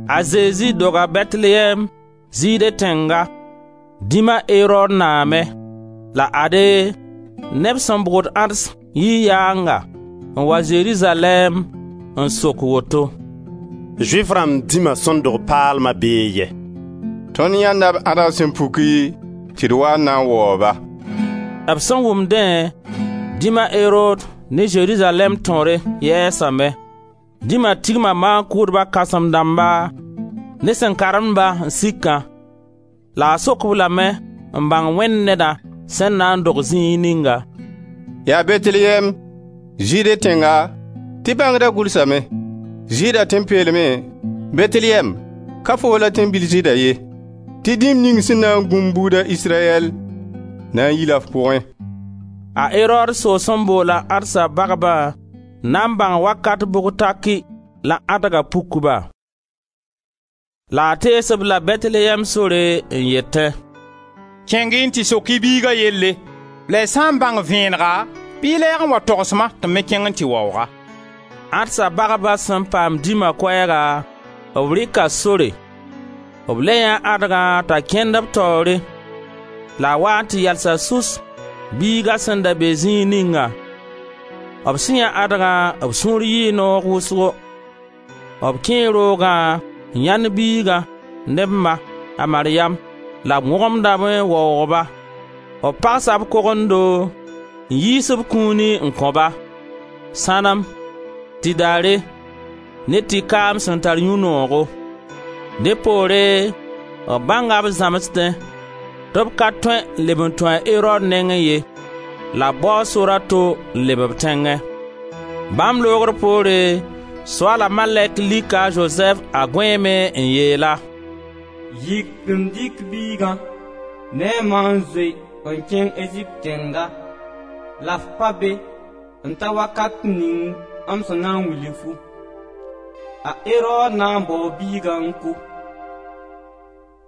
A Zezi doga Bɛtelyɛɛm, Zɩɩde tẽnga, dĩm a Erod naamẽ, la ade, neb sẽn bʋgd ãds yii yaanga n wa Zerizalɛɛm n sok woto: «Zʋɩf rãmb dĩma sẽn dog paalma bee yɛ? Tõnd yãenda b ãdg sẽn puki tɩ d wa n na n waoog-ba.» B sẽn wʋm dẽ, dĩm a Erod ne Zerizalɛɛm tõre yɛɛsame. Dĩma tigma maan-kʋʋdba kãsem dãmba ne sẽn karem-ba n sikã la a sok-b lame n bãng Wẽnd Nedã sẽn na n dog zĩig ninga. «Yaa Bɛtelyɛɛm, Zɩɩde tẽnga, tɩ bãngda gʋlsame: Zɩɩda tẽn-peelmẽ Bɛtelyɛɛm, ka foo la tẽn-bil Zɩɩda ye, tɩ dĩm ning sẽn na n gũ m buuda Israyɛl, na n yila f pʋgẽ.» A Erod soos n boola ãdsa bagbã n na n bãng wakat bʋg taki la ãdga puk-ba, la a tees-b la Bɛtelyɛɛm sore n yetẽ: «Kẽng-y n tɩ sok-y biiga yelle, la y sã n bãng vẽenega, bɩ y lɛɛg n wa togs-ma tɩ m me kẽng n tɩ waoog-a.» Ãdsa bagba sẽn paam dĩma koɛɛga, b rɩka sore; b le yãee ãdgã t'a kẽnd b taoore la a waa n tɩ yalsa sus biiga sẽn da be zĩig ningã. B sẽn yãe ãdgã b sũur yɩɩ noog wʋsgo. B kẽe roogã n yãend biiga ne b ma, a Maryam, la b wõgemdame n waoog-ba; b pagsa b kogendo n yiis b kũuni n kõ-ba: sãnem, tɩdare, ne tɩ-kaam sẽn tar yũ-noogo. Dẽ poore b bãnga b zãmsdẽ tɩ b ka tõe n leb n tũ a Erod nengẽ ye, la b bao sor a to n leb b tẽngẽ. Bãmb loogr poore, Soaala malɛk lika a Zozɛf a gũeemẽ n yeel-a: «Yik n dɩk biiga ne a ma n zoe n kẽng Ezipt tẽnga la f pa be n ta wakat ning m sẽn na n wilg fu; a Erod na n baoo biigã n kʋ.»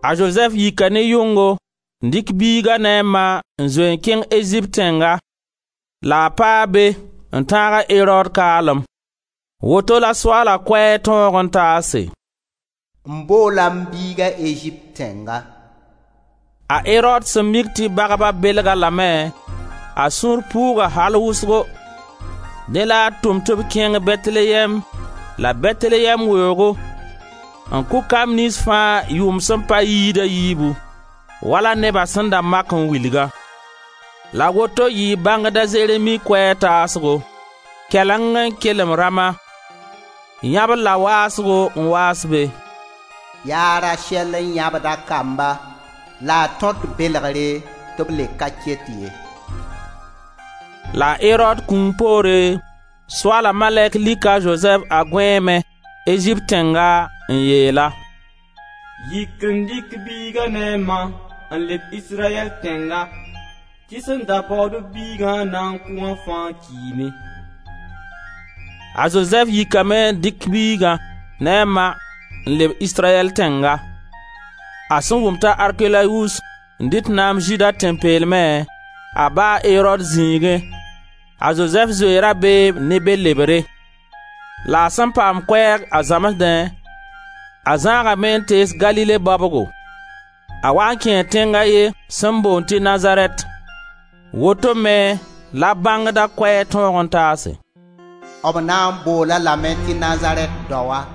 A Zozɛf yika ne yʋngo n dɩk biiga ne a ma n zoe n kẽng Ezipt tẽnga, la a paa be n tãag a Erod kaalem. Woto la Soaala koɛɛg tõog n taase: M boola m biiga Ezipt tẽnga. A Erod sẽn mik tɩ bagba belg-a lame, a sũur puuga al wʋsgo, dẽ la a tʋm tɩ b kẽng Bɛtelyɛɛm la Bɛtelyɛɛm weoogo n kʋ kamb niyns fãa yʋʋm sẽn pa yɩɩd a yiibu, wala neba sẽn da mak n wilgã. La woto yɩɩ bãngd a Zeremi koɛɛg taasgo: Kɛleng n kelem Rama yãbr la waasgo n waas be: ya a Rasɛl n yãbd a kamba la a tõt belegre tɩ b le ka ket ye. La a Erod kũum poore, Soaala malɛk lika a Zozɛf a gõeemẽ, Ezipt tẽnga, n yeel-a: «Yik n dɩk biiga ne a ma n leb Israyɛl tẽnga tɩ sẽn da baood-b biigã n na n kʋ wã fãa kiime.» A Zozɛf yikame n dɩk biiga ne a ma n leb Israyɛl tẽnga. A sẽn wʋm t'a Arkelawus n dɩt naam Zɩɩda tẽn-peelmẽ, a ba, a Erod, zĩigẽ, a Zozɛf zoe rabeem ne be lebre, la a sẽn paam koɛɛg a zãmsdẽ, a zãagame n tees Galile baobgo, a waa n kẽe tẽng a ye sẽn boond tɩ Nazarɛt. Woto me la bãngda koɛɛg tõog n taase: B na n bool-a lame tɩ Nazarɛt daoa.